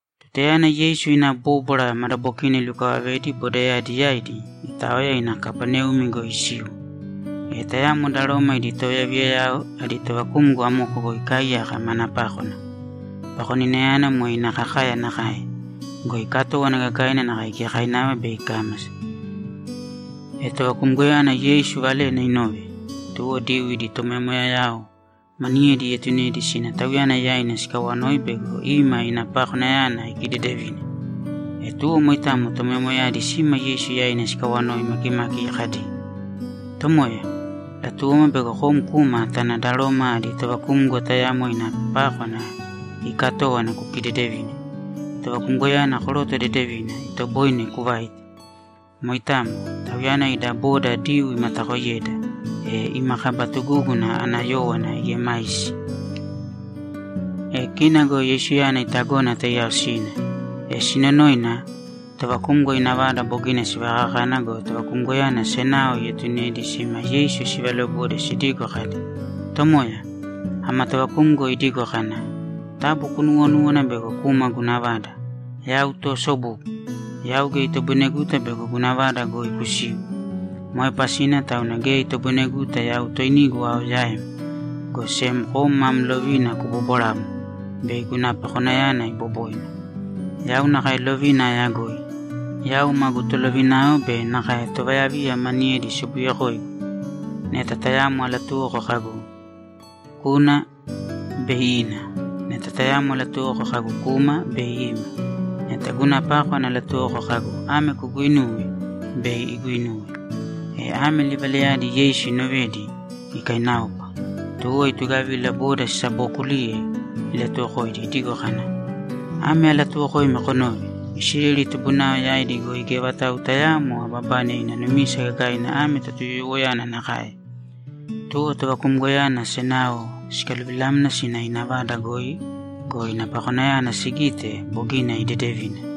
Tutayana Yeisu ina bóbwara madabokina ilukavavedi bodayadi yaidi, itaoya ina Kapaneumi goi isiu. E tayamo da Roma idi tovayaviyayao adi tovakumgo amoko goi ikaaiyaka mana pákwana. Pakoninayana moe ina kakaya nakae go, ikatówana gagaina nakae giyakainava bei ikámasa. E tovakumgoyana Yeisu valena inove, tuwo Diyuu idi tomoyamoyayao maniyedi ietunedi sina Tauyana yaina sikawanoi bego ima ina pakonayana ikidedevine. E tuwo moitamo tomoyamoyayadi sima Yeisu yaina sikawanoi makimaki kadi, ‘Tomoya, latuwoma bego kom kuma tana da Roma adi tovakumgo tayamo ina pákwana iikatówana kukidedevine. Tovakumgoyana koroto dedevina, itoboine kuvaite. Moitamo. Tauyana ida bodao Diyuu imatakoiyeda, e ima kaba tugúguna ana yówana iemaisi.’ E kina go Yeisuyana itagona taiyao sina. E sinonoina, tovakumgo ina vada bogina sivakakana go, tovakumgoyana senao ietunedi sima Yeisu sivalobode sidigo kadi, ‘Tomoya, ama tovakumgo idigo kana, “Taabu kunuuwonūwana bego kuma guna vada. Yau toosobugu; yau geya itoboineguta bego guna vada goi kusiu. Moe pasina tauna geya itoboineguta yau toinigu ao yaim, go sem kom mam lovina kubobwarāmo, bei guna pakonayana iboboina. Yau nakae lovina ayagoi. Yau magu tolovinao be nakae tovayaviya maniyedi sobuyekoigu. Neta tayamo alatuwoko kagu, ‘Kūna’, bei ina. Neta tayamo alatuwoko kagu, ‘Kūma’, bei ima. Neta guna pákwana alatuwoko kagu, ‘Ame kuguinūwe’, bei iguinuwe.”’ E ame livalayadi Yeisu inovedi, ikainaopa. Tuwo itugavila, boda sisabookuliye ilatuwokoidi idigo kana, ‘Ame alatuuwokoimi konōve! Isileli tubunao yaidi goi geya vatau tayaamo ababane ina numisa gagaina ame Totuyoyowoyana nakae.’ Tuwo tovakumgoyana senao sikaluvilamna sina ina vada goi go, ina pakonayana sigite, bogina idedevina.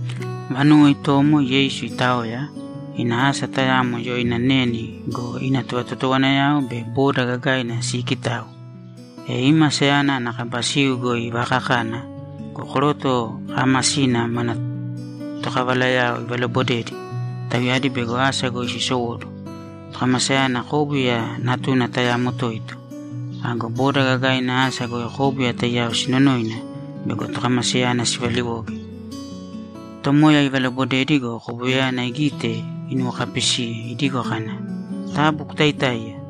Vanuwo itomo Yeisu itaoya, ina asa tayamo yoina Neni go, ina tovatotowanayao be boda gagaina siikitau. E ima asayana ana kaba siu goi ivaakakana go, koroto kaamasina mana tokavalayao ivalobodedi, tauyadi bego asa goi sisowóduwo. Tokamasayana kóbuya natuna tayamo toito. Ago boda gagaina asa goi kóbuya taiyao sinonoina bego tokamasayana sivaliwoge. Tomoya ivalobodedi go, kobuyayana igite, inuwokapisiye idigo kana, ‘Taabu kutaitāiya!’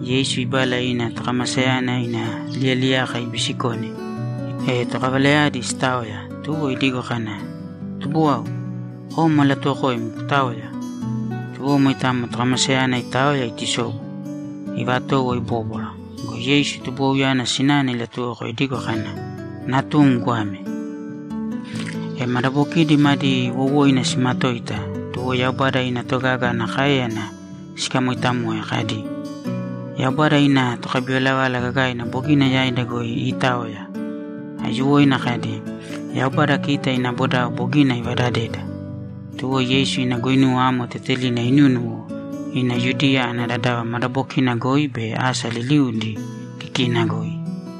Yeisu ibala ina tokamasayana ina liyaliyaka ibisikone, e tokavalayadi sitaoya, tuwo idigo kana, ‘Tubuwau, kom alatuwokoim kutāoya!’ Tuwo moitamo, tokamasayana itaoya itusobu, ivatowo ibóbwara. Go Yeisu tubuwauyana sinana ilatuwoko idigo kana, ‘Natum goame.’ E madabokidi madi wowoina simatoita, tuwo Yaubada ina togaga ana káeyana sikamoitamoe kadi, ‘Yaubada ina tokabivalavala gagaina bogina yaida goi iitaoya!’ Aiyuwoina kadi, ‘Yaubada kita ina bodao bogina ivadadeda!’ Tuwo Yeisu ina guinuwa amo tetelina inúnuwo ina Yudiya ana dadava madabokina goi be asa liliudi kikina goi.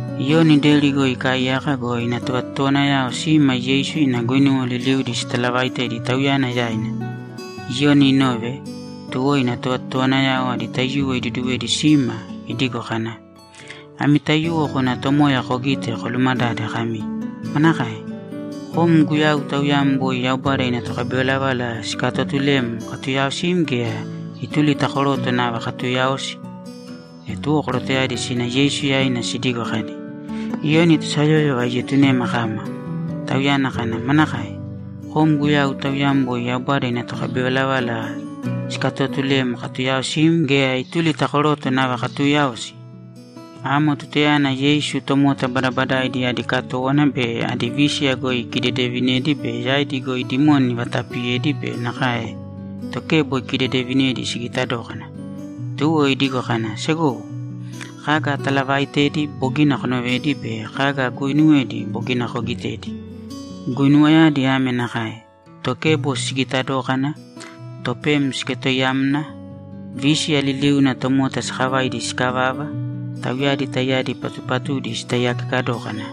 Iyoni deri goi ikaaiyaka go, ina tovatotowanayao sima Yeisu ina guinuwa liliudi sitalavaitedi tauyana yaina. Iyoni inove, tuwo ina tovatotowanayao adi taiyuwo iduduwedi sima idigo kana, ‘Ami taiyuwo kōna Tomoya kogīte kolumadāde kami, “Manakae? Kom Guyau Tauyam boi Yaubada ina tokabivalavala sikatotulem katuyaaosim gea, ituli ta koroto nava katuuyaosi?”’ E tuwo korotoyadi sina Yeisu yaina sidigo kadi, ‘Iyoni tosayóyova ietunema kama. Tauyana kana, “Manakae? Kom Guyau Tauyam boi Yaubada ina tokabivalavala sikatootulem katuyaaosim, gea ituli ta koroto nava katuuyaosi?”’ Amo tutayana Yeisu tomota badabadaidi adi katówana be adi vísiya goi ikidedevinedi be yaidi goi dimoni ivatapiyedi be nakae tokebo ikidedevinedi sigita dókana. Tuwo idigo kana, ‘Segowo, kaga atalavaaitedi bogina konovedi be kaga aguuinuwedi bogina kogitedi. Guinuwayadi ame nakae: Tokebo sigita dókana, topem siketoiyamna, vísiya liliuna tomota sakavaidi sikavava, tauyadi taiyadi patupatudi sitaiyakeka dókana,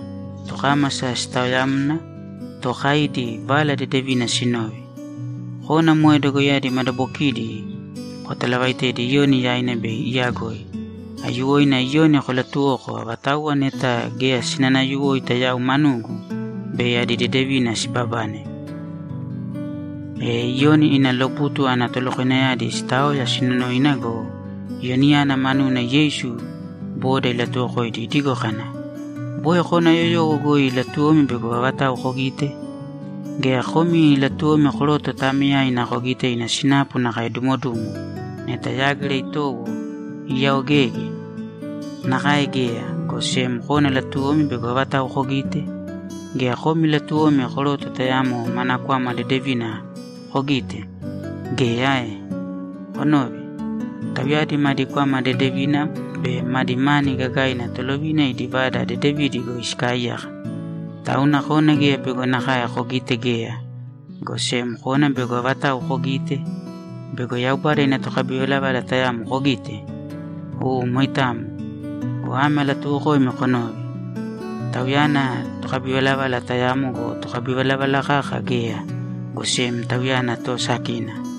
tokámasa sitaoyamna, tookaidi Vala Dedevina sinove. Kōna moe dogoiyadi madabokidi kotalavaitēdi Iyoni yaina bei iyagoi. Aiyuwoina Iyoni kolatuwōko avatauwa neta geya sinanayuwoita yau manugu, bei adi dedevina sibabane.’ E Iyoni ina lobutu ana tolokoinayadi sitaoya sinonoina go, Iyoniyana manuna Yeisu boda ilatuwokoidi idigo kana, ‘Boi kona yoyowo goi latuwomi bego avatau kogite? Gea, komi latuwomi koroto taameyaina kogite ina sinapu nakae dumodumo neta yágira itowo, iyaoegeege? Nakae geya, go sem kona latuwomi bego avatau kogite? Gea, komi latuwomi koroto tayamo mana kwama dedevina kogite? Geya ae? Konōve. Tauyadi madi kwama dedevina be madi mani gagaina tolovina idi vada dedevidi goi sikaaiyaka. Tauna kona geya bego nakae kogite geya, go sem kona bego avatau kogite? Bego Yaubada ina tokabivalavala tayamo kogite? U moitamo. Go ame alatuuwokoimi konōve: Tauyana tokabivalavala tayamo go, tokabivalavala kaka geya, go sem tauyana toosakina.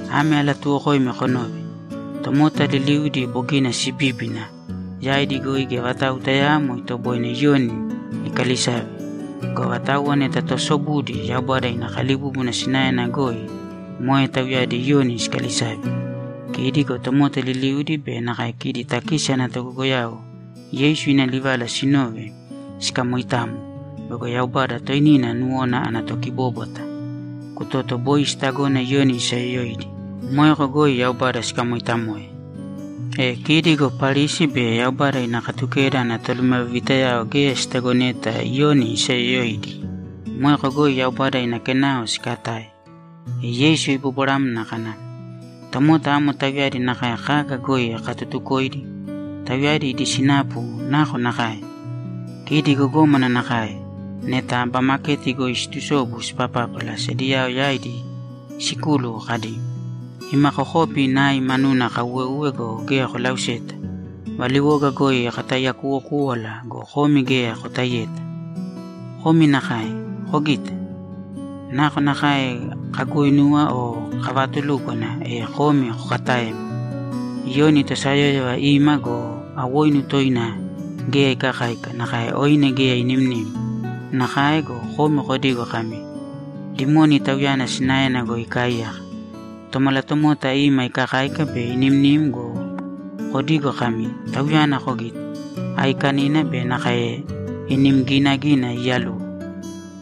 Ame alatuuwokoimi konōve: Tomota liliudi bogina sibíbina, yaidi goi geya vatau tayaamo itoboine Iyoni ikalisave. Go avatauwa neta toosobudi Yaubada ina kalibúbuna sinaena goi, moe tauyadi Iyoni sikalisave.’ Kidi go tomota liliudi be nakae kidi takisi ana togogoyao Yeisu ina livala sinove, sikamoitamo bego Yaubada toinina nuwona ana tokibóbwata. Kutoto boi sitagona Iyoni isayoyoidi. Moeko goi Yaubada sikamoitamoe. E kidi go Parisi be Yaubada ina Katukeda ana tolumavivitayao geya sitagoneta Iyoni isayoyoidi. Moeko goi Yaubada ina kenao sikatae. E Yeisu ibobwaramna kana, ‘Tomota amo tauyadi nakae kaga goi akatutukoidi? Tauyadi idi sinapu nakonakae? Kidi gogómana nakae neta aba maketi goi siitusobu sipapápala sediyao yaidi sikúluwo kadi, “Ima kokopi nai manuna kauweuwe go, geya kolauseta. Valiwoga goi kataiyakuwokúwala go, komi geya kotaiyeta.” Komi nakae. Kogita? Nakonakae kaguuinuwa o kavaatulúkwana, e komi kokataema. Iyoni tosayóyova ima go, awoinu toina geya ikakáika, nakae oine geya inimnim. Nakae go, komi kodigo kami, “Dimoni tauyana sinaena goi ikaaiyaka.” Tomalatomota ima ikakáika be inimnim go, kodigo kami, “Tauyana kogite? Aiikanina be nakae inim ginagina iiyaluwo.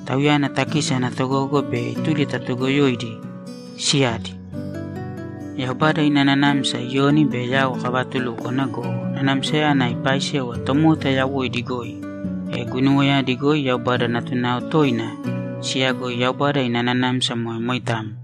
Tauyana takisi ana togogo be ituli ta toogoyoidi siyadi!” Yaubada ina nanamsa Iyoni be yau kavatulúkwana go, nanamsayana ipaaisewa tomota yawoidi goi, e guinuwayadi goi Yaubada natunao toina siyagoi Yaubada ina nanamsa moe moitamo.’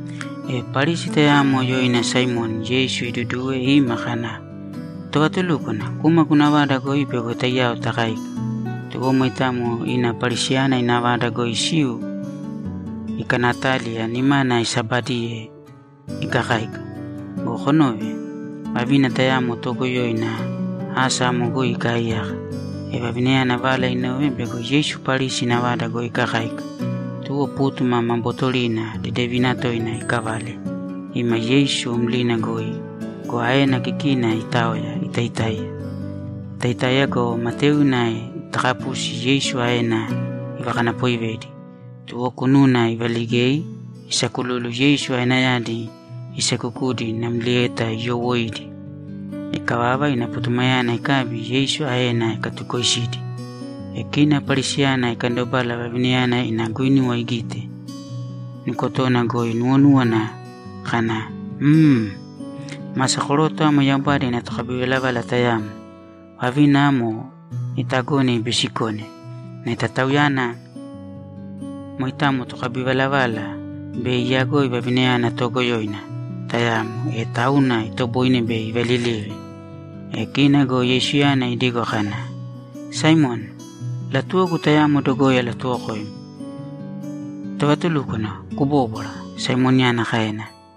E Parisi tayamo yoina Saimoni Yeisu iduduwe ima kana, ‘Tovatulúkwana, kūma guna vada goi bego taiyao takáika.’ Tuwo moitamo ina Parisiyana ina vada goi isiu ikanataliya nimana isabadiye ikakáika. Go konōve. Vavina tayamo toogoyoina asa amo goi ikaaiyaka. E vavinayana vala inove bego Yeisu Parisi ina vada goi ikakáika. Tuwo pútuma ma bootorina dedevina toina iikavale ima Yeisu mlina goi go, aena kikina itaoya, itaitáiya. Itaitáiya go, mataiuna sitakapusi Yeisu aena ivakanapoivedi. Tuwo kununa ivaligei isakululu Yeisu aenayadi iseekukudi namlieta iyowoiidi. Ikavava, ina putumayana ikabi, Yeisu aena ikatukoisidi. E kina Parisiyana ikandobala, vavinayana ina guinuwa igite, nukotona goi inuwonúwana kana, ‘Mmm masa koroto amo Yaubada ina tokabivalavala tayamo. Vavina amo itagone ibiisikone. Neta Tauyana moitamo tokabivalavala, bei iyagoi vavinayana toogoyoina tayamo, e tauna itoboine bei ivalilive.’ Go kina Yeisuyana idigo kana, ‘Saimoni, latuwogu tamo dogoi alatuwokoim.’ ‘Tovatulúkwana, kubōbwara’, Saimoniyana kaena.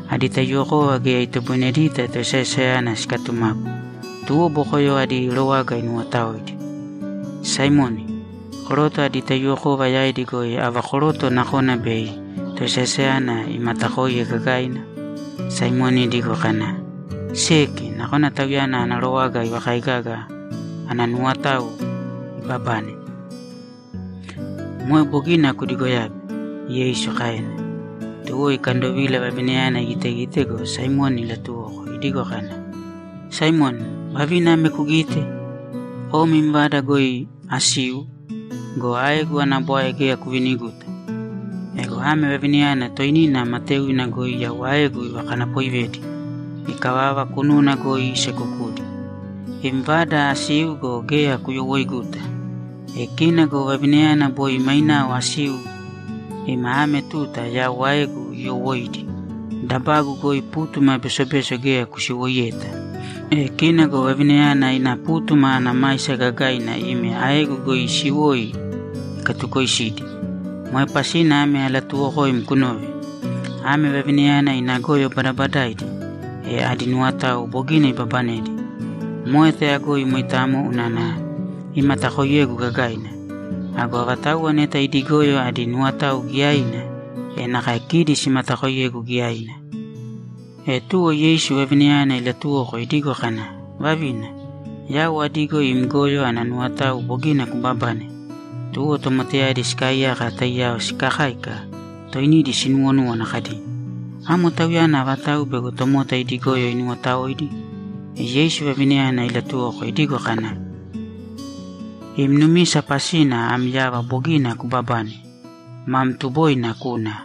Adi taiyuwokova geya itoboinedita toesaesayana sikatumapu, tuwo bokoyo adi rowaga inuwotaoidi. Saimoni, koroto adi taiyuwokova yaidi goi ava koroto nakona bei toesaesayana imatakoiye gagaina?’ Saimoni idigo kana, ‘Seki, nakona tauyana ana rowaga ivakaigaga ana nuwotao ibabane.’ ‘Moe bogina kudigoyabe’, Yeisu kaena. Tuwo ikandovila vavinayana igitegite go, Saimoni ilaatuwoko idigo kana, ‘Saimoni, vavina ame kugite? Kom im vada goi asiu go, aegu ana bwae geya kuviniguta. Ego ame vavinayana toinina mataiuna goi yau aegu ivakanapoivedi. Ikavava, kununa goi isekukudi. Im vada asiu go, geya kuyowoiiguta. E kina go vavinayana boi mainao asiu ima ame tuta yau aegu iyowoiidi. Dabagu goi pútuma besobeso geya kusiwoiyeta. E kina go vavinayana ina pútuma ana maisa gagaina ime aegu goi isiwoi ikatukoisidi. Moe pasina ame alatuuwokoim kunōve: Ame vavinayana ina goyo badabadaidi, e adi nuwotao bogina ibabanedi. Moe tayagoi moitamo unana imatakoiyegu gagaina. Ago avatauwa neta idi goyo adi nuwotao giyaina, e nakae kidi simatakoiyegu giyaina.’ E tuwo Yeisu vavinayana ilatuwoko idigo kana, ‘Vavina, yau adigo im goyo ana nuwotao bogina kubabane.’ Tuwo tomotayadi sikaaiyaka taiyao sikakáika toinidi sinuwonúwana kadi, ‘Amo Tauyana avatau bego tomota idi goyo inuwotaoidi?’ E Yeisu vavinayana ilatuwoko idigo kana, ‘Im numisa pasina am yava bogina kubabane. Mam tuboina kūna.’